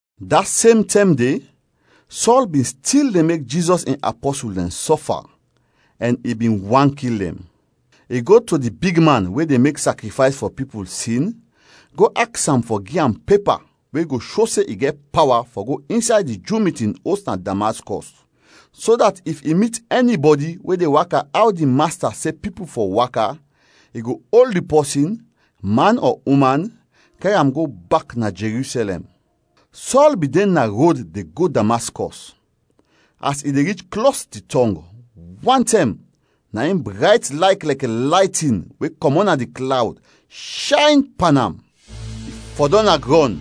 Da sem tɛm de, Sɔl bin stil de mek Jizɔs in apɔsul dɛn sɔfa, ɛn i bin want kil dɛn. I go to di bigman we de mek sakrifays fɔ pipul sin go aks am fɔ gi am pepa we go sho se i gɛt pawa fɔ go insay di Ju mitin os na Damaskɔs, so dat if i mit ɛnibɔdi we de waka aw di Masta se pipul fɔ waka, i go ol di pɔsin, man ɔ uman, kɛr am go bak na Jerusɛlɛm. Sɔl bin de na rod de go Damaskɔs; as i de rich klos di tɔng, wantɛm, na in brayt layt lɛkɛ laytin we kɔmɔt na di klawd shayn pan am. I fɔdɔm na grɔn,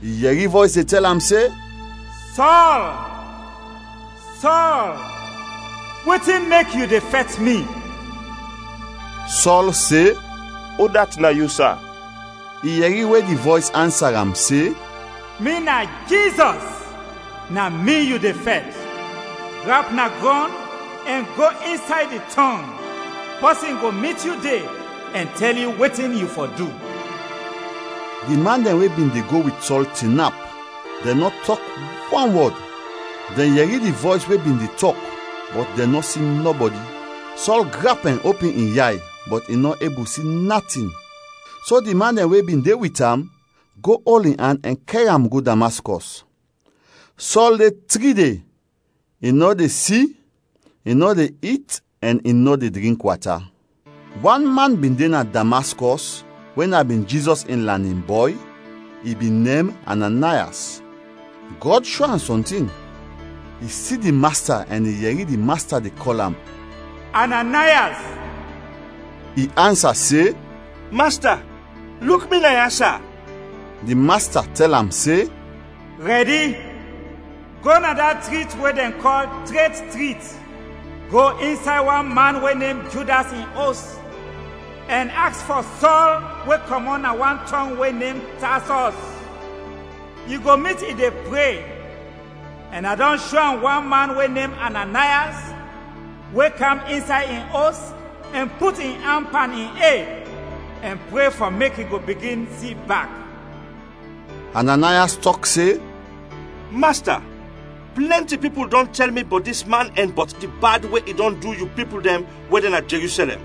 i yɛri vɔys de tɛl am se, “Sɔl, Sɔl, wetin mek yu de fɛt mi?” Sɔl se, “Udat na yu, sa?” I yɛri we di vɔys ansa am se, “Mi na Jizɔs, na mi yu de fɛt. Grap na grɔn ɛn go insay di tɔng, pɔsin go mit yu de ɛn tɛl yu wetin yu fɔ du.” Di man dɛn we bin de go wit Sɔl tinap, dɛn nɔ tɔk wan wɔd. Dɛn yɛri di vɔys we bin de tɔk, bɔt dɛn nɔ si nɔbɔdi. Sɔl grap ɛn opin in yay, bɔt i nɔ ebul si natin. So di man dɛn we bin de wit am go ol in an ɛn kɛr am go Damaskɔs. Sɔl de tri de, i nɔ de si, i nɔ de it, ɛn i nɔ de drink wata. Wan man bin de na Damaskɔs we na bin Jizɔs in lanin bɔy, i bin nem Ananayas; Gɔd sho am sɔntin. I si di Masta ɛn i yɛri di Masta de kɔl am, “Ananayas!” I ansa se, “Masta, luk mi naya, sa.” Di Masta tɛl am se, “Rɛdi, go na da trit we dɛn kɔl Tret Trit; go insay wan man we nem Judas in os ɛn aks fɔ Sɔl we kɔmɔt na wan tɔng we nem Tasɔs. Yu go mit i de pre ɛn a dɔn sho am wan man we nem Ananayas we kam insay in os ɛn put in an pan in ed ɛn pre fɔ mek i go bigin si bak.” Ananayas tɔk se, “Masta, plɛnti pipul dɔn tɛl mi bɔt dis man ɛn bɔt di bad we i dɔn du yu pipul dɛn we de na Jerusɛlɛm.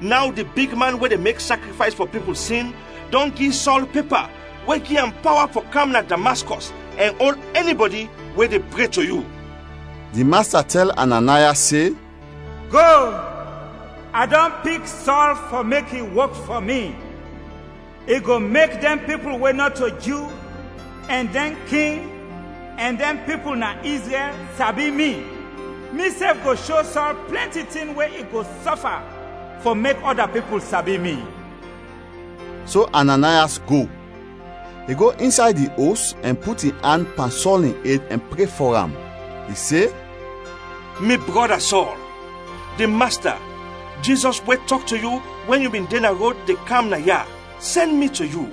Naw di bigman we de mek sakrifays fɔ pipul sin dɔn gi Sɔl pepa we gi am pawa fɔ kam na Damaskɔs ɛn ol ɛnibɔdi we de pre to yu.” Di Masta tɛl Ananayas se, “Go, a dɔn pik Sɔl fɔ mek i wok fɔ mi. I go mek dɛn pipul we nɔto Ju ɛn dɛn king ɛn dɛn pipul na Izrɛl sabi mi. Misɛf go sho Sɔl plɛnti tin we i go sɔfa fɔ mek ɔda pipul sabi mi.” So Ananayas go; i go insay di os ɛn put in an pan Sɔl in ed ɛn pre fɔ am. I se, “Mi brɔda Sɔl, di Masta, Jizɔs we tɔk to yu wɛn yu bin de na rod de kam naya, sɛn mi to yu.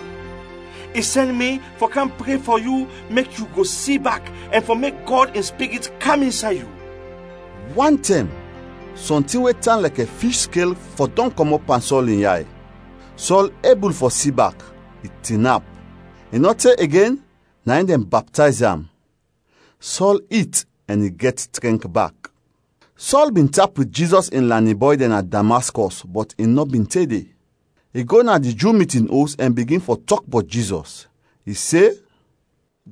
I sɛn mi fɔ kam pre fɔ yu mek yu go si bak ɛn fɔ mek Gɔd in Spirit kam insay yu.” Wantɛm, sɔntin we tan lɛkɛ fish skel fɔdɔm kɔmɔt pan Sɔl in yay. Sɔl ebul fɔ si bak, i tinap. I nɔ te igen, na in dɛn baptayz am. Sɔl it ɛn i gɛt trɛnk bak. Sɔl bin tap wit Jizɔs in lanin bɔy dɛn na Damaskɔs bɔt i nɔ bin te de. I go na di Ju mitin os ɛn bigin fɔ tɔk bɔt Jizɔs. I se,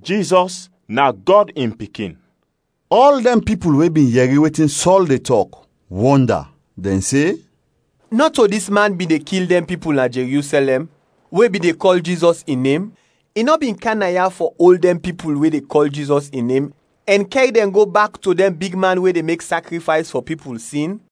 “Jizɔs na Gɔd in Pikin.” Ɔl dɛn pipul we bin yɛri wetin Sɔl de tɔk, wɔnda; dɛn se, “Nɔto dis man bin de kil dɛn pipul na Jerusɛlɛm we bin de kɔl Jizɔs in nem? I nɔ bin kam naya fɔ ol dɛn pipul we de kɔl Jizɔs in nem ɛn kɛr dɛn go bak to dɛn bigman we de mek sakrifays fɔ pipul sin?”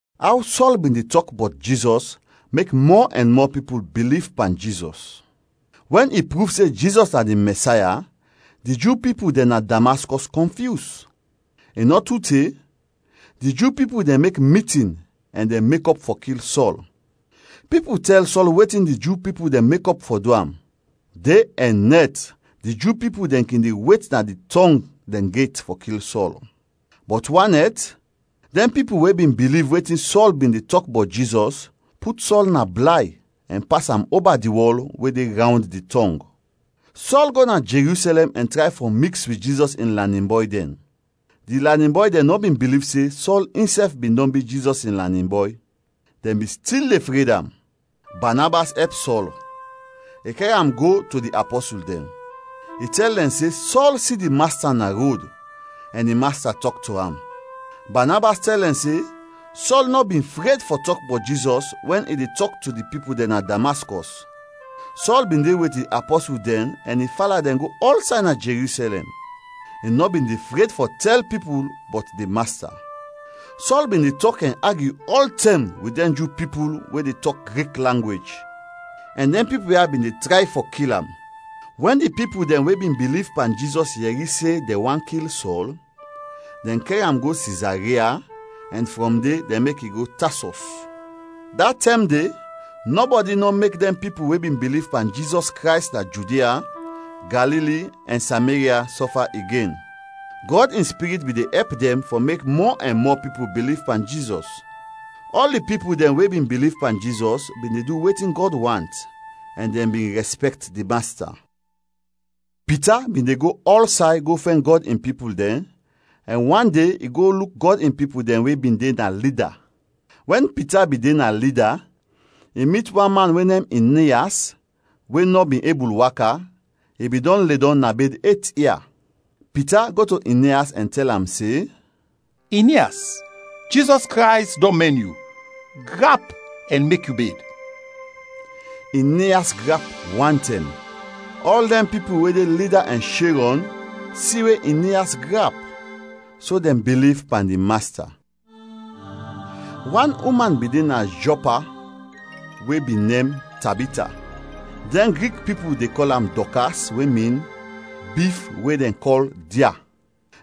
Aw Sɔl bin de tɔk bɔt Jizɔs mek mɔ ɛn mɔ pipul biliv pan Jizɔs. Wɛn i pruv se Jizɔs na di Mɛsaya, di Ju pipul dɛn na Damaskɔs kɔnfyus. I nɔ tu te, di Ju pipul dɛn mek mitin ɛn dɛn mekɔp fɔ kil Sɔl. Pipul tɛl Sɔl wetin di Ju pipul dɛn mekɔp fɔ du am. De ɛn nɛt di Ju pipul dɛn kin de wet na di tɔng dɛn get fɔ kil Sɔl. Bɔt wan nɛt, dɛn pipul we bin biliv wetin Sɔl bin de tɔk bɔt Jizɔs, put Sɔl na blay ɛn pas am oba di wɔl we de rawnd di tɔng. Sɔl go na Jerusɛlɛm ɛn tray fɔ miks wit Jizɔs in lanin bɔy dɛn. Di lanin bɔy dɛn nɔ bin biliv se Sɔl insɛf bin dɔn bi Jizɔs in lanin bɔy. Dɛn bin stil de fred am. Banabas ɛp Sɔl, i kɛr am go to di apɔsul dɛn. I tɛl dɛn se Sɔl si di Masta na rod ɛn di Masta tɔk to am. Banabas tɛl dɛn se Sɔl nɔ bin fred fɔ tɔk bɔt Jizɔs wɛn i de tɔk to di pipul dɛn na Damaskɔs. Sɔl bin de wit di apɔsul dɛn ɛn i fala dɛn go ɔlsay na Jerusɛlɛm; i nɔ bin de fred fɔ tɛl pipul bɔt di Masta. Sɔl bin de tɔk ɛn agyu ɔltɛm wit dɛn Ju pipul we de tɔk Grik langwej ɛn dɛn pipul ya bin de tray fɔ kil am. Wɛn di pipul dɛn we bin biliv pan Jizɔs yɛri se dɛn want kil Sɔl, dɛn kɛr am go Sizaria ɛn frɔm de, dɛn mek i go Tasɔs. Da tɛm de, nɔbɔdi nɔ mek dɛn pipul we bin biliv pan Jizɔs Krays na Judia, Galili, ɛn Sameria sɔfa igen. Gɔd in Spirit bin de ɛp dɛn fɔ mek mɔ ɛn mɔ pipul biliv pan Jizɔs. Ɔl di pipul dɛn we bin biliv pan Jizɔs bin de du wetin Gɔd want ɛn dɛn bin rɛspɛkt di Masta. Pita bin de go ɔlsay go fɛn Gɔd in pipul dɛn, ɛn wan de i go luk Gɔd In pipul dɛn we bin de na Lida. Wɛn Pita bin de na Lida, i mit wan man we nem Inias we nɔ bin ebul waka, i bin dɔn ledɔm na bed et ia. Pita go to Inias ɛn tɛl am se, “Inias, Jizɔs Krays dɔn mɛn yu. Grap ɛn mek yu bed.” Inias grap wantɛm. Ɔl dɛn pipul we de Lida ɛn Sherɔn si we Inias grap, so dɛn biliv pan di Masta. Wan uman bin de na Jɔpa we bin nem Tabita. (Dɛn Grik pipul de kɔl am Dɔkas we min, bif we dɛn kɔl dia.)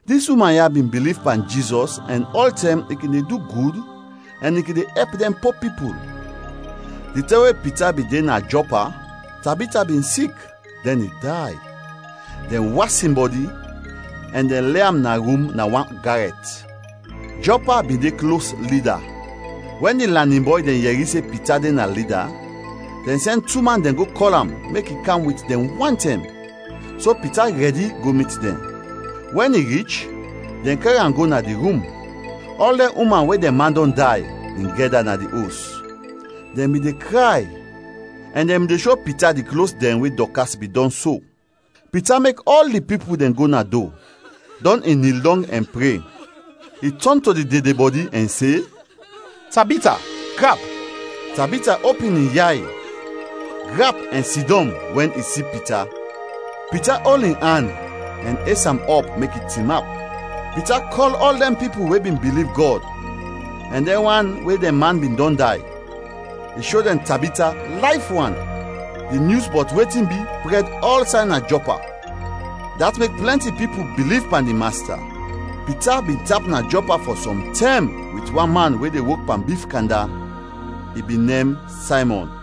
Dis uman ya bin biliv pan Jizɔs ɛn ɔltɛm i kin de du gud ɛn i kin de ɛp dɛn po pipul. Di tɛm we Pita bin de na Jɔpa, Tabita bin sik, dɛn i day. Dɛn was in bɔdi ɛn dɛn le am na rum na wan garɛt. Jɔpa bin de klos Lida. Wɛn di lanin bɔy dɛn yɛri se Pita de na Lida, dɛn sɛn tu man dɛn go kɔl am, mek i kam wit dɛn wantɛm. So Pita rɛdi go mit dɛn. Wɛn i rich, dɛn kɛr am go na di rum. Ɔl dɛn uman we dɛn man dɔn day, bin gɛda na di os. Dɛn bin de kray ɛn dɛn bin de sho Pita di klos dɛn we Dɔkas bin dɔn so. Pita mek ɔl di pipul dɛn go na do, dɔn i nil dɔng ɛn pre. I tɔn to di dedebɔdi ɛn se, “Tabita, grap!” Tabita opin in yay, grap ɛn sidɔm wɛn i si Pita. Pita ol in an ɛn es am ɔp mek i tinap. Pita kɔl ɔl dɛn pipul we bin biliv Gɔd ɛn dɛn wan we dɛn man bin dɔn day; i sho dɛn Tabita layf wan. Di nyus bɔt wetin bi prɛd ɔlsay na Jɔpa. Dat mek plɛnti pipul biliv pan di Masta. Pita bin tap na Jɔpa fɔ sɔm tɛm wit wan man we de wok pan bif kanda, i bin nem Saymɔn.